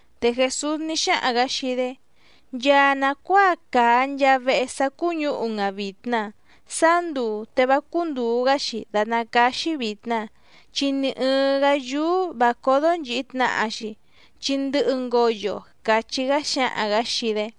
Te Jèsús ní xáhaⁿ‑gǎ xii‑dé: —Nchaa nàcuáa càa nchaa vehe sá cúñǔhu‑n‑a vìtna sáá nduu te vá cúndùu‑gá‑xi dàtná cáá‑xí vìtna, chi ni ɨ̀ɨⁿ‑gá yúú vǎ códó nchìhi tnaha‑xi, chi ndɨhɨ ngoyo —càchí‑gá xǎhaⁿ‑gǎ xii‑dé.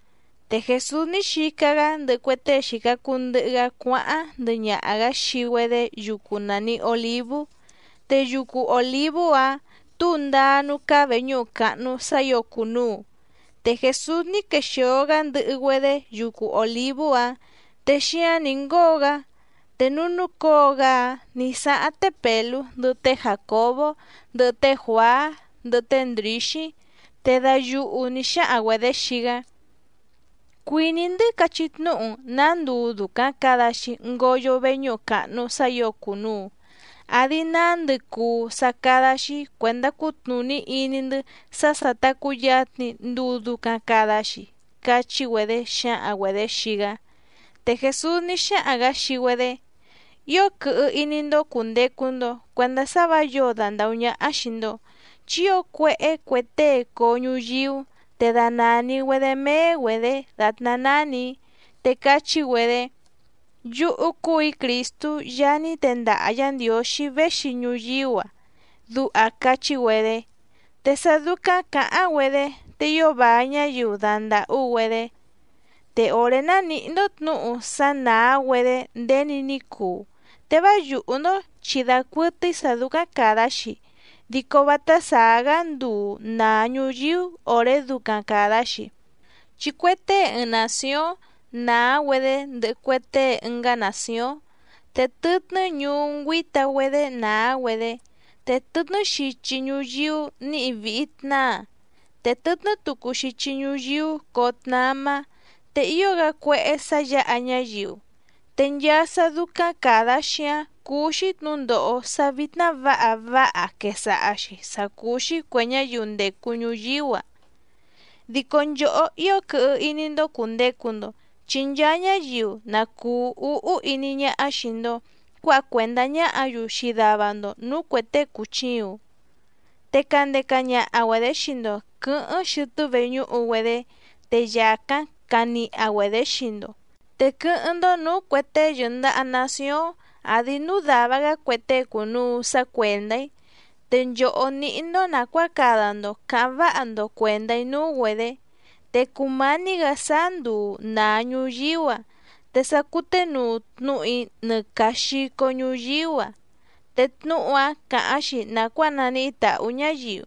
Te Jèsús ní xica‑gá ndɨhɨ cue tée xìca cuu ndɨhɨ‑gá cuáháⁿ ndɨhɨ ñaha‑gǎ xii‑güedé yucu nàni Olívú, te yucu Òlívú‑áⁿ tǔu ndáá núú cáá vèñúhu càhnu sá ǐo cùnuu. Te Jèsús ní quexìo‑gá ndɨhɨ‑güedé yucu Òlívú‑áⁿ, te xíáⁿ nǐ ngóo‑gá te núú núcǒo‑gá‑áⁿ nǐ sáháⁿ té Pèlú ndɨhɨ té Jàcobó ndɨhɨ té Juàá ndɨhɨ té Ndrǐxí, te dayuhu nǐ xáhaⁿ‑güedě xii‑gá: —Cuìní‑ndɨ́ cachí tnúhu‑n nǎ nduu dùcaⁿ cada‑xi ngoyo veñúhu càhnu sá ǐo cùnuu, àdi nándɨ cùu sá cádá‑xí cuèndá cutnùní iní‑ndɨ́ sá sà ta cuyatni nduu ducaⁿ cada‑xi —cachí‑güedé xǎhaⁿ‑güedě xii‑gá. Te Jèsús ní xáhaⁿ‑gǎ xii‑güedé: —Ío quɨhɨ iní‑ndó cùndecu‑ndo cuendá sá vǎ yǒo dandàhú ñáhá xìi‑ndo. Chi ío cuéhé cue tée coo ñuyíú te danàni‑güedé méé‑güedě dàtná nánì‑í, te cachí‑güedé: “Yúhú cúù‑í Crìstú Yaá ní tendaha Yǎ Ndiǒxí véxi ñuyíú‑a”, duha cachí‑güedé. Te sá dúcáⁿ cǎháⁿ‑güedé te ío vài ñáyiu dandàhú‑güedé. ’Te òré ná nìhí‑ndó tnǔhu sá nàá‑güedé nděni ní cuu, te vá yùhú‑ndó chi dacuɨtɨ́í sǎ dúcáⁿ càda‑xi, dico vátá sàá‑gá nduu nàa ñuyíú òré ducaⁿ càda‑xi. Chi cue tée ɨɨⁿ nàcióⁿ nàá‑güedé ndɨhɨ cue tée ɨngá nàcióⁿ, te tɨtnɨ́ ñuú ngüíta‑güedé nàá‑güedé, te tɨtnɨ́ xichi ñuyíú nǐhi vìhi tnáa, te tɨtnɨ́ tucu xichi ñuyíú coo tnamá, te ío‑gá cuéhé sǎ yǎha ñáyiu. Te nchaa sá dúcáⁿ càda‑xi‑áⁿ cúú‑xí tnǔndòho sá vítná vǎha váha quèsaha‑xi sácúú‑xí cuè ñáyiu ndècu ñuyíú‑a. ’Dico nchòhó ío quɨhɨ iní‑ndó cùndecu‑ndo, chi nchaa ñáyiu na cùu úhú iní ñáhá xìi‑ndo cuáha cuèndá ñáhǎ‑yu xii dava‑ndo nǔú cuè tée cùchiuⁿ, te candeca ñaha‑güedě xii‑ndo quɨ̌hɨ́ⁿ xɨtɨ́ veñúhu‑güedé, te yàcáⁿ caniha‑güedě xii‑ndo. Te quɨ́hɨ́ⁿ‑ndó nǔú cuè tée yɨ̀ndaha nacióⁿ àdi núú dàva‑gá cue tée cùnuu sá cuèndá‑í, te nchòhó níhí‑ndó nàcuáa cada‑ndo cǎháⁿ váha‑ndo cuèndá‑í núú‑güedě. Te cùmání‑gǎ sáá nduu nàa ñuyíú‑a te sa cuténuu tnúhu‑í nɨ càa xico ñuyíú‑a, te tnúhu‑áⁿ càháⁿ‑xi nàcuáa naníhí tǎhú ñǎyiu.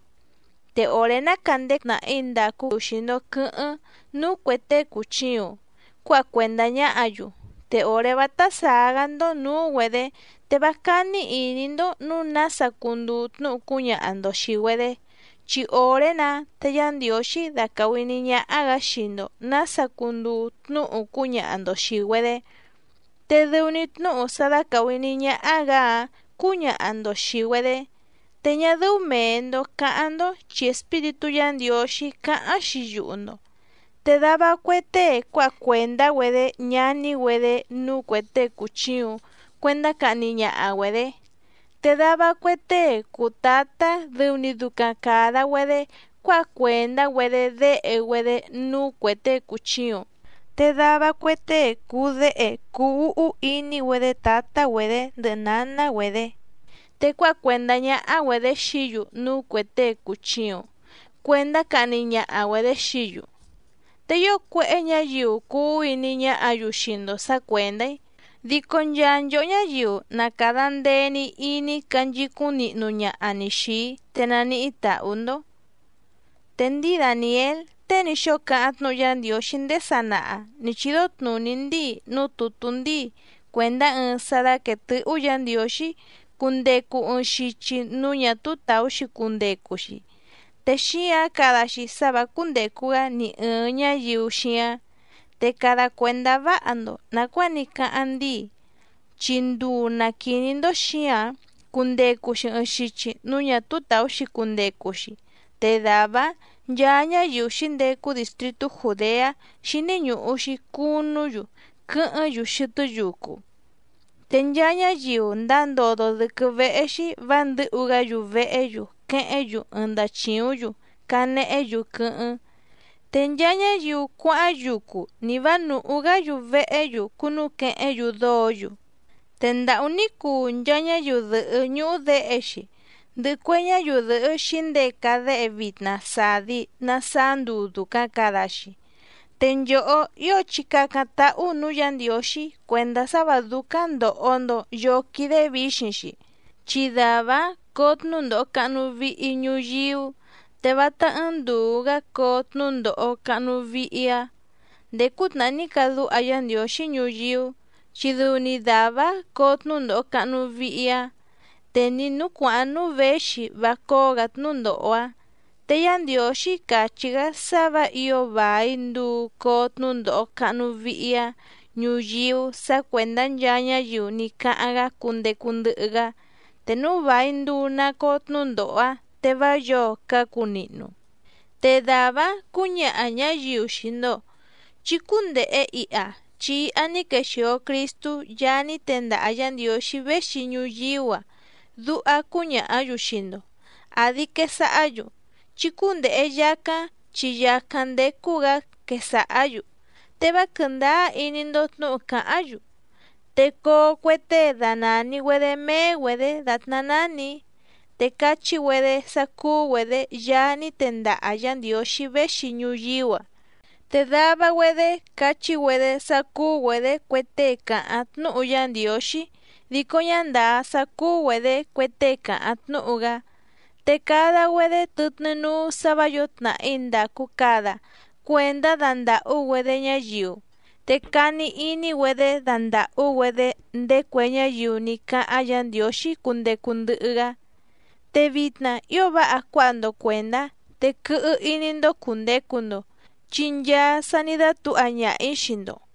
Te òré ná càndeca ñaha ñáyiu xii‑ndo quɨ̌hɨ́ⁿ núú cuè tée cùchiuⁿ cuáha cuèndá ñáhǎ‑yu, te òré vátá sàá‑gá‑ndó nǔú‑güedě te vá cání ìní‑ndó nǔu nása cunduu tnúhu cúñaha‑ndo xìi‑güedé. Chi òré‑nǎ te Yá Ndiǒxí dacàhu iní ñáhá‑gǎ xii‑ndo nǎsa cunduu tnúhu cúñaha‑ndo xìi‑güedé, te dɨu‑ni tnúhu sá dácàhu iní ñáhá‑gǎ‑áⁿ cǔñaha‑ndo xìi‑güedé. Te ñá dɨ́ú mèe‑ndo cáháⁿ‑ndó chi Espíritú Yǎ Ndiǒxí cáháⁿ‑xi yuhu‑ndo. Te dava cue tée cuáha cuèndá‑güedé ñaní‑güedé núú cuè tée cùchiuⁿ cuendá cahni ñaha‑güedě. Te dava cue tée cùu tátá dɨu‑ni ducaⁿ càda‑güedé cuáha cuèndá‑güedé déhe‑güedé núú cuè tée cùchiuⁿ. Te dava cue tée cùu déhe cuu úhú iní‑güedé tǎtá‑güedě ndɨhɨ nǎná‑güedě, te cuáha cuèndá ñáhá‑güedě xií‑yu núú cuè tée cùchiuⁿ cuendá cahni ñaha‑güedě xií‑yu. Te ío cuéhé ñǎyiu cuu úhú iní ñáhǎ‑yu xii‑ndo sǎ cuèndá‑í, dico nchaa nchòhó ñáyiu na càda ndee‑ni iní canchicúⁿ nihnu ñaha‑ni xìi‑í te naníhí tàhú‑ndó. ’Te ndíi Dàniél tée ní xóo cáháⁿ tnúhu Yá Ndiǒxí ndéé sanaha nǐ chídó tnùní ndíi núú tùtú ndíi cuèndá ɨɨⁿ sá dáquèe tɨ́hú Yǎ Ndiǒxí cundecu ɨɨⁿ xichi núú ñà túú tàú‑xi cundecu‑xi, te xíǎⁿ cada‑xi sá vǎ cúndècu‑gá ni ɨ̀ɨⁿ ñáyiu xíáⁿ. Te cada cuèndá váha‑ndo nàcuáa ní cáháⁿ ndíi, chi nduu na quìní‑ndó xǐǎⁿ cundecu‑xi ɨɨⁿ xichi núú ñà túú tàú‑xi cundecu‑xi, te dàvá‑áⁿ nchaa ñáyiu xǐndecu distrìtú Jùdeá xíní ñùhu‑xi cunú‑yu quɨ́hɨ́ⁿ‑yu xɨtɨ́ yucu. Te nchaa ñáyiu ndáa ndódó dɨ̀quɨ́ véhé‑xí vǎ ndɨ̌hu‑gá‑yu vehé‑yu quehéⁿ‑yu ɨɨⁿ ndachìúⁿ‑yu canehé‑yu quɨ́hɨ́ⁿ. Te nchaa ñáyiu cuáháⁿ yucu ni vǎ nùhú‑gá‑yu vehé‑yu cúnúquehéⁿ‑yu dóǒ‑yu. ¡Te ndàhú ní cuu nchaa ñáyiu dɨ̀hɨ́ ñúhú děhe‑xi, ndɨhɨ cue ñáyiu dɨ̀hɨ́ xǐndeca déhe vitna sàdi na saá nduu dùcaⁿ cada‑xi! Te nchòhó ío chí càcáⁿ táhú nǔú Yǎ Ndiǒxí cuèndá sá vǎ dúcáⁿ ndòho‑ndo yóó quídé vǐxiⁿ‑xi. Chi dàvá‑áⁿ coo tnúndòho cahnu vihi ñuyíú, te vátá ɨ́ɨ́ⁿ ndùu‑gá coo tnúndòho cahnu vihi‑áⁿ nděé cútnàhá ní cadúha Yá Ndiǒxí ñuyíú, chi dɨu‑ni dàvá‑áⁿ coo tnúndòho cahnu vihi‑áⁿ, te ni nǔú cuàháⁿ núú věxi vá cóó‑gǎ tnúndòho‑áⁿ. Te Yá Ndiǒxí càchí‑gá sá vǎ ǐo vài nduu coo tnúndòho cahnu vihi‑áⁿ ñuyíú sǎ cuèndá nchaa ñáyiu ní cáháⁿ‑gá cundecu ndɨhɨ‑gá. Te núu vài nduu na coo tnúndòho‑áⁿ, te vá yǒo cácu nihnu. ’Te dàvá‑áⁿ cǔñaha ñǎyiu xii‑ndo: “Chí cúndèhe iha, chi iha ní quexìo Cristú Yaá ní tendaha Yǎ Ndiǒxí véxi ñuyíú‑a”, duha cúñàhá‑yu xii‑ndo. Àdi quesahá‑yu: “Chí cúndèhe yacáⁿ chi yàcáⁿ ndécú‑gǎ”, quesàhá‑yu. Te vá quɨ̀ndáá iní‑ndó tnǔhu càháⁿ‑yu. Te coo cue tée danàni‑güedé méé‑güedě dàtná nánì‑í te cachí‑güedé sá cúú‑güedě Yaá ní tendaha Yǎ Ndiǒxí véxi ñuyíú‑a. Te dava‑güedé cachí‑güedé sá cúú‑güedě cue tée càháⁿ tnúhu Yá Ndiǒxí dico ñá ndàá sá cúú‑güedě cue tée càháⁿ tnúhu‑gá, te cada‑güedé tɨtnɨ́ núú sǎ vǎ yǒo tnàhí ndàcu cada cuendá dandàhú‑güedé ñáyiu, te cani iní‑güedé dandàhú‑güedé ndéé cue ñáyiu ní cáháⁿ Yǎ Ndiǒxí cundecu ndɨhɨ‑gá. Te vitna ío váha cuáha‑ndo cuèndá, te quɨhɨ iní‑ndó cùndecu‑ndo, chi nchaa sa ní dátǔha ñaha‑ǐ xii‑ndo.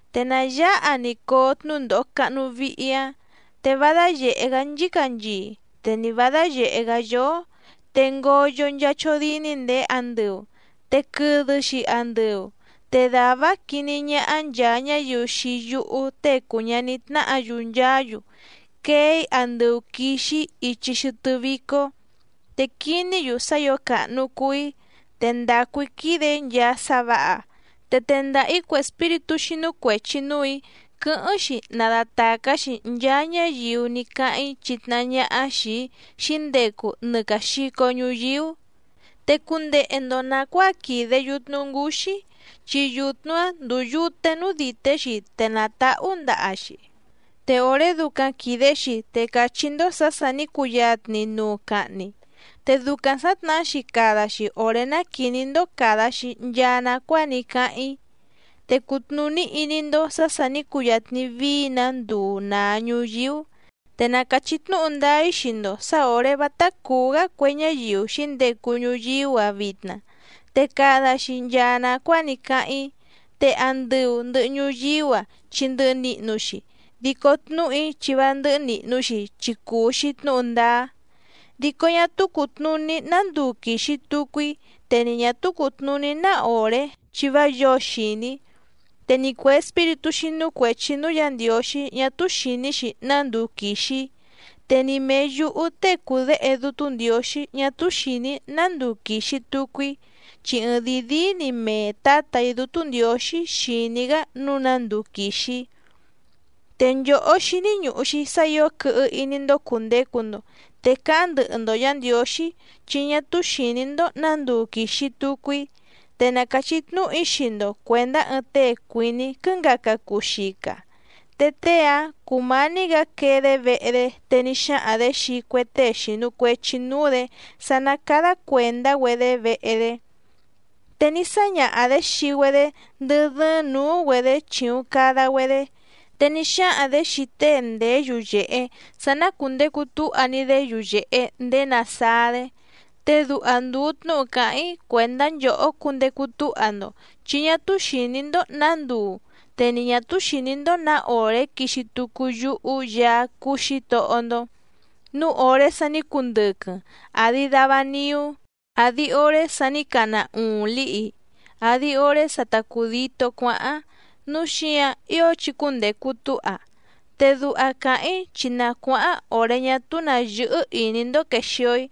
’Te nà yáha‑ni coo tnúndòho cahnu vihi‑áⁿ, te vá dáyèhé‑gá nchícanchii te ni vǎ dáyèhé‑gá yóó. Te ngoyo nchaa chódíní ndèé andɨu, te quɨdɨ‑xi andɨu. Te dàvá‑áⁿ quiní ñáhá nchàa ñáyiu xii yúhú Tée cùu ñaní tnáhǎ‑yu nchaá‑yu quee‑í andɨu quìxi‑í ichi xɨtɨ́ vícó, te quiní‑yu sá ǐo càhnu cuu‑í, te quìde‑í nchaa sá vǎha. Te tendaha‑ǐ cue espíritú xínú cuèchi núù‑í quɨ́hɨ́ⁿ‑xi nadatàcá‑xi nchaa ñáyiu ní cáháⁿ‑í chitnahá ñáhá xìi‑í xǐndecu nɨ càa xico ñuyíú. ’Te cundehe‑ndo nàcuáa quìde yutnu ngúxí, chi yutnu‑áⁿ ndúú yùte núú dìté‑xi te nàtahú ndaha‑xi, te òré ducaⁿ quìde‑xi te càchí‑ndó sǎ sà ní cuyatni nuu cahni. Te ducaⁿ sǎtnahá‑xi cada‑xi òré ná quìní‑ndó càda‑xi nchaa nacuáa ní cáháⁿ‑í, te cutnùní iní‑ndó sǎ sà ní cuyatni vií‑nǎ nduu nàa ñuyíú. Te na càchí tnúhu ndáá‑í xii‑ndo sǎ òré vátá cùú‑gá cue ñáyiu xǐndecu ñuyíú‑a vitna, te cada‑xi nchaa nàcuáa ní cáháⁿ‑í. Te andɨu ndɨ̀hɨ ñuyíú‑a chi ndɨhɨ nihnu‑xi, dico tnúhu‑í chi vá ndɨ́hɨ́ nìhnu‑xi chi cùu‑xi tnúhu ndáá. ’Dico ñá túú cùtnuní ná nduu quìxi tucu‑í, te ni ñà túú cùtnuní ná òré chi vá yǒo xìní, te ni cuè espíritú xínú cuèchi núú Yǎ Ndiǒxí ñá túú xìní‑xi ná nduu quìxi‑í, te ni mèe yúhú tée cùu Déhe Dútú Ndiǒxí ñá túú xìní‑í ná nduu quìxi tucu‑í, chi ɨɨⁿdìi díí‑ni mee Tǎtà‑í Dútú Ndiǒxí xìní‑gá nǔu ná nduu quìxi‑í. ’Te nchòhó xíní ñùhu‑xi sá ǐo quɨhɨ iní‑ndó cùndecu‑ndo, te cáháⁿ ndɨhɨ‑ndo Yǎ Ndiǒxí, chi ñá túú xìní‑ndó nǎ nduu quìxi tucu‑í. Te na càchí tnúhu‑í xii‑ndo cuèndá ɨɨⁿ tée cuìní quɨ́ngaca cuu xica. Te tée‑áⁿ cùmání‑gǎ quee‑dé vehe‑dé te ní xáhaⁿ‑dě xii cue tée xìnu cuechi núú‑dě sá ná cádá cuèndá‑güedé vehe‑dé. Te ní sáñaha‑dě xii‑güedé ndɨ́ dɨ́ɨ́ⁿ nǔú‑güedě chìuⁿ cada‑güedé. Te ní xáhaⁿ‑dě xii tée ndèé yuyèhe sá ná cùndecu túha‑ni‑dé yuyèhe ndéé nàsáá‑dé. Te duha ndùu tnúhu càháⁿ‑í cuèndá nchòhó cundecu túha‑ndo, chi ñá túú xìní‑ndó nǎ nduu te ni ñà túú xìní‑ndó nǎ òré quixi tucu yúhú Yaá cúú Xǐtohó‑ndó, núu òré sa ní cundɨquɨⁿ, àdi dava niú, àdi oré sa ní cana uuⁿ lǐhi, àdi oré sa ta cùditó cuáháⁿ, núu xíǎⁿ ío chí cúndècu túha. Te duha càháⁿ‑í chi na cuáháⁿ òré ñá túú nǎ yɨ́hɨ́ ìní‑ndó quèxio‑í,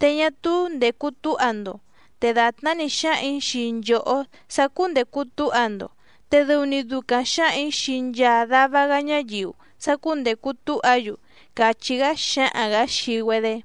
te ñá túú ndècu túha‑ndo. Te dàtná‑ni xǎhaⁿ‑ǐ xii nchòhó sá cúndècu túha‑ndo, te dɨu‑ni ducaⁿ xǎhaⁿ‑ǐ xii nchaa dava‑gá ñáyiu sá cúndècu túha‑yu —càchí‑gá xǎhaⁿ‑gǎ xii‑güedé.